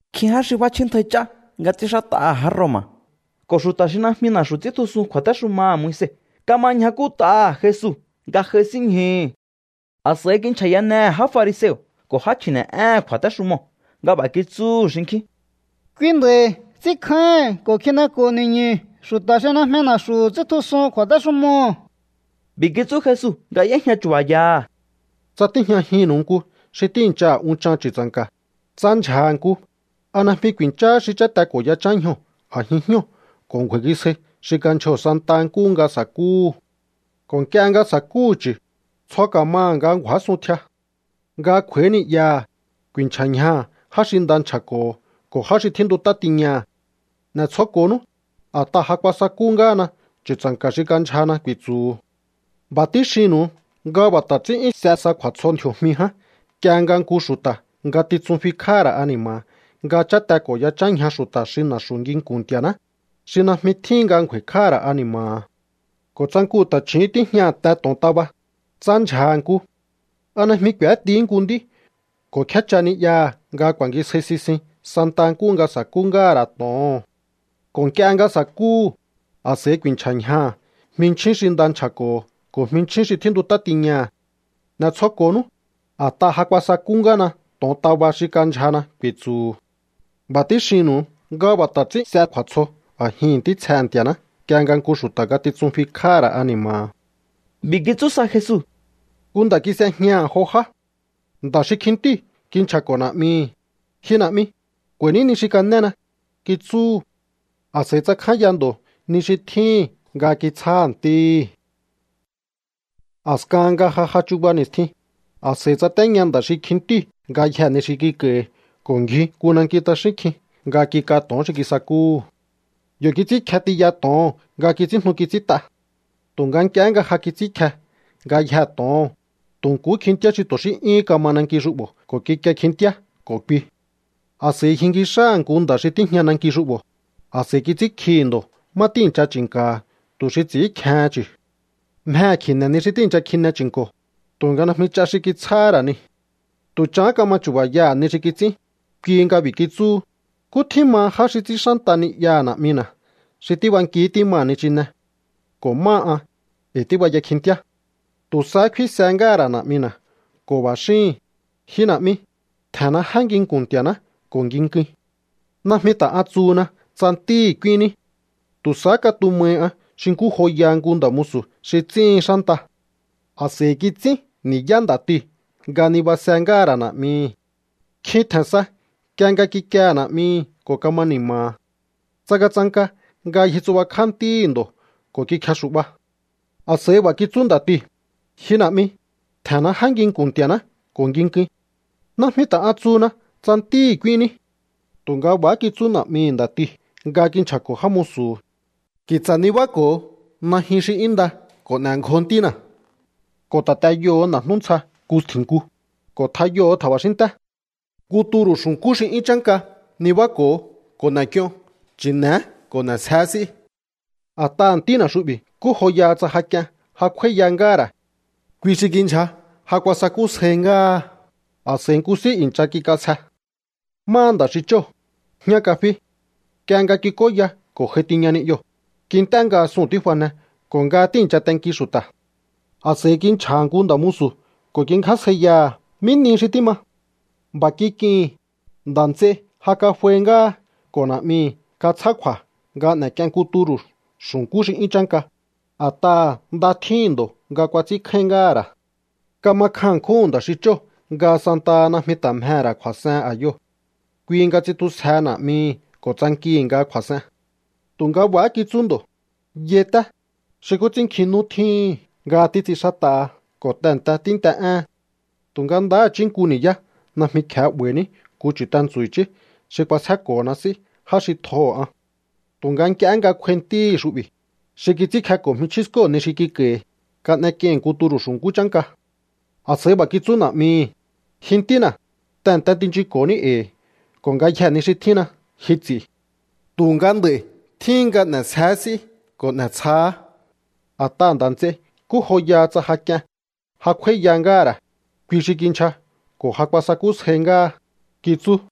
Nkjín já xi f'áchjíntjai ch'á nga ts'ínxát'aha̱ já Roma̱ ko̱ xu̱ta̱ xi najmi na̱xu̱ ts'íntjusun kju̱a̱téxumaha̱ Moise kama ñjakút'aha̱ Jesu nga j'aisínñjuhu̱. A̱s'a̱i kinchja̱yanehe̱ já fariseo̱ ko̱ já chji̱ne̱'éhe̱n kju̱a̱téxumoo̱ nga b'a̱ kitsúhu̱ xinkjín: —Kui nda̱i̱ ts'ínkjáíhi̱n ko̱ kjineko̱ ni̱ñu̱ xu̱ta̱ xi najmi na̱xu̱ ts'íntjusun kju̱a̱texumoo̱. B'i̱ kitsú Jesu nga y'éjña chu̱ba̱yaha̱: —Tsa tíjñajinnu̱u nku xi tíi̱nchaha̱ unchan chu̱tsa̱nka̱, tsa ndyja̱ha̱ nku, ¿a najmi ku̱i̱ncháhá xi cháte ko̱ yachán ñjoo̱ a̱jin jñóo̱ ko̱ ngju̱a̱i̱ngisjai xi kandyjoo̱ santa nkúhu nga sa̱kúhu̱? Ko̱ nk'ie nga sa̱kúhu̱ chu̱, tsjo ka̱maha̱ nga ngju̱ásun tjia. Nga kj'u̱a̱í ni'yaha̱, ku̱i̱nchja̱ ñjaha̱ já xi nda nchja̱ko̱ho̱ ko̱ já xi tjíntut'á tiñaha̱. “N'e̱tsjoko̱nú, a̱t'aha̱ ja kuasakú ngáhana chu̱tsa̱nka̱ xi kandyjana”, ku̱i̱tsu̱hu̱. ’B'a̱ tíxinnu̱u nga b'a̱ ta̱ ts'ín 'yún s'e sa kju̱a̱tsjo ndji̱o̱jmi ján nk'ie nga nku xu̱ta̱ ngatitsun fikj'áha̱ ra̱ ani̱ma̱ha̱ nga cháte ko̱ yachán ñja xu̱ta̱ xi na̱xu̱ nginku̱n Nti̱a̱ná, xi najmi tjíhin nga ngju̱a̱i̱kj'áha̱ ra̱ ani̱ma̱ha̱. ’Ko̱ tsa nku ta̱chju̱ún tíjñaha̱ te to̱ontaba, tsa ndyja̱ha̱ nku, ¿a najmi k'u̱étihí nku nd'í ko̱ kjécha ni'yaha̱ nga ku̱a̱ngisjáí sisin santa nkúhu nga sa̱kú ngáha̱ ra̱ to̱oho̱n? Ko̱ nk'ie nga sa̱kúhu̱, a̱s'a̱i ku̱i̱nchja̱ ñjaha̱ jminchjín xi nda nchja̱ko̱ho̱ ko̱ jminchjín xi tjíntut'á tiñaha̱. “N'e̱tsjoko̱nú, a̱t'aha̱ ja kuasakú ngáhana to̱ontaba xi kandyjana”, ku̱i̱tsu̱hu̱. B'a̱ tíxinnu̱u nga b'a̱ ta̱ ts'ín s'e kju̱a̱tsjo a̱jihi̱n ntítsjehe̱ Nti̱a̱ná nk'ie nga nku xu̱ta̱ ngatitsun fikj'áha̱ ra̱ ani̱ma̱ha̱. B'i̱ kitsú sa Jesu: —Nku nda̱ kis'ejñaha̱ jo já. Nda̱ xi kjintíu̱ kinchja̱ko̱ na̱'mihi̱: “Ji na̱'mi, k'u̱a̱i̱ní ni xi kanéna”, kitsúhu̱. A̱s'a̱i tsakjánya ndo̱ ni xi tjíhi̱n nga kitsjáha̱ ntíhí. A̱skahan nga ja j'a chuba ni̱stjin, a̱s'a̱i tsatéña nda̱ xi kjintíu̱ ngayjee̱ ni xi kik'a̱i̱hi̱ ko̱ ngji nku nanki t'axín kjin nga kik'a to̱on xi kisakúhu̱. Yo̱ kits'ínkje tiya to̱oho̱n nga kits'ínjnu kits'ínt'a. Tu̱nga nk'ie nga ja kits'ínkje ngayjee̱ to̱oho̱n, tu̱ nkuhú kjintíá xi tu̱ xí 'yúhún kama nanki xu'bo̱ ko̱ kikie kjintíá ko̱ kui. A̱s'a̱i ngjinki xáha̱ nku nda̱ xi tíjña nanki xu'bo̱, a̱s'a̱i kits'ínkjihi̱ ndo̱ má tíi̱ncha chi̱nka̱ha̱ tu̱ xi ts'i̱ínkjehen chu̱. Mjehe̱ kji̱ne̱ ni xi tíi̱ncha kjine chi̱nko̱, tu̱nga najmi ch'a xi kitsjáhá ra̱ niu̱. ’Tu̱ chahán kama chu̱ba̱yaha̱ ni xi kits'ín, kui nga b'i̱ kitsúhu: “Nkú tjín maha já xi ts'ín xánta ni'yaha̱ na̱'mina̱ xi tíb'anki tímaha̱ nichine. Ko̱ máha an, e̱i̱ tíbaya kjintíá. Tu̱ sahá kfínse ngáha̱ ra̱ na̱'mina̱ ko̱ b'a̱ xíhi̱n: Ji na̱'mi, tje̱nna jé nginku̱n Nti̱a̱ná ko̱ nginkuin. Najmi ta̱ an tsuhuna tsa ntíhi̱ k'úínní. Tu̱ sahá katumahi an xi nkú joyaha nku nda̱ musu̱ xi ts'íhin xánta.” A̱s'a̱i kits'ín ni̱yá nda̱tiu̱ nga nibase ngáha̱ ra̱ na̱'mihi. Kjin tje̱n sa nk'ie nga kikiehe̱ na̱'mihi ko̱ kama ni̱ma̱ha̱. Tsangatsanka nga ngjitsubakjá ntíhi̱ ndo̱ ko̱ kikjexu̱'ba. A̱s'a̱i b'a̱ kitsú nda̱tiu̱: “Ji na̱'mi, tje̱nna jé nginku̱n Nti̱a̱ná ko̱ nginkuin. Najmi ta̱ an tsuhuna tsa ntíhi̱ k'úíhinní.” ’Tu̱nga b'a̱há kitsú na̱'mihi̱ nda̱tiu̱ nga kinchja̱ko̱ já musu̱hu̱: “Ki̱tsa̱ nibáko̱o najyun xi 'yún nda ko̱ n'e̱ngjo ntína̱, ko̱ ta̱ t'eyoho̱o na̱jnú ntsja nku stji̱nk'un, ko̱ tjayoho̱o tja̱ba̱xínnté. Nku turu̱ xu̱nkú xi 'yún chánka nibáko̱o ko̱ n'e̱k'ion. Chi̱ne̱é ko̱ n'e̱sjeé s'í. A̱t'aha̱ ntína̱ xu'bi̱ nkú joyaha tsa ja k'ien ja kj'úáíya ngáha̱ ra̱. Kui xi kindyja ja kuasakusjáí ngáha.” A̱s'a̱i nku s'í i̱ncha kik'asje. ’Máha nda̱ xi chóo̱, jñá kafí. Nk'ie nga kik'óya ko̱ j'ai tiña ni'yoo̱, kint'é nga suu̱n tífane ko̱ nga tíi̱ncha tenki xu̱ta̱. A̱s'a̱i kinchja̱ha̱ nku nda̱ musu̱ ko̱ kingjásjaiyaha̱ mí nihi xi tíma. B'a̱ kik'ihi̱n: “Nda̱ nts'ei ja kaf'ai ngáha ko̱ na̱'mihi̱ katsjá kju̱a̱ nga kan'ek'ien nku turu̱ xu̱nkú xi 'yún chánka, a̱t'aha̱ nda tjíhi̱n ndo̱ nga kuats'ínkjáín ngáha̱ ra̱.” Kama kjan ṉkjúhu̱n nda̱ xi chóo̱ nga santaha najmi ta̱ mjehe̱ ra̱ kju̱a̱s'ehen a̱yoo̱. Kui nga tsitjusjehe na̱'mihi̱ ko̱ tsankihi̱ nga kju̱a̱s'en. Tu̱nga b'a̱há kitsú ndo̱: “Yai, té, xi nkú ts'ín nkjin nú tjíhi̱n nga títs'inxát'aha ko̱ tehe̱nte tínt'e'éhen, tu̱nga ndaha̱chí nku ni̱yá najmi kje̱ 'ba̱i̱ní nku chu̱tentsu̱ i̱chí xi k'uasjéko̱hona s'í já xi tjoho̱ an. Tu̱nga nk'ie nga kj'uai ntíhi̱ xu'bi̱, xi kits'ínkjeko̱ jminchjín skóo̱ ni xi kik'a̱i̱hi̱, kan'ek'ieihi̱n nku turu̱ xu̱nkú chánka.” ’A̱s'a̱i b'a̱ kitsú na̱'mihi̱: “Ji ntína̱, tehe̱nte tinchunko̱ní e̱i̱, ko̱ ngayjee̱ ni xi tjínna̱ ji ts'i̱. Tu̱nga nd'a̱i̱ tjíhin nga n'e̱sjeé s'í ko̱ n'e̱tsjaá, a̱t'aha̱ nda̱ nts'ei nkú joyaha tsa ja k'ien ja kj'úáíya ngáha̱ ra̱. Kui xi kindyja ko̱ ja kuasakúsjáí ngáha”, kitsú.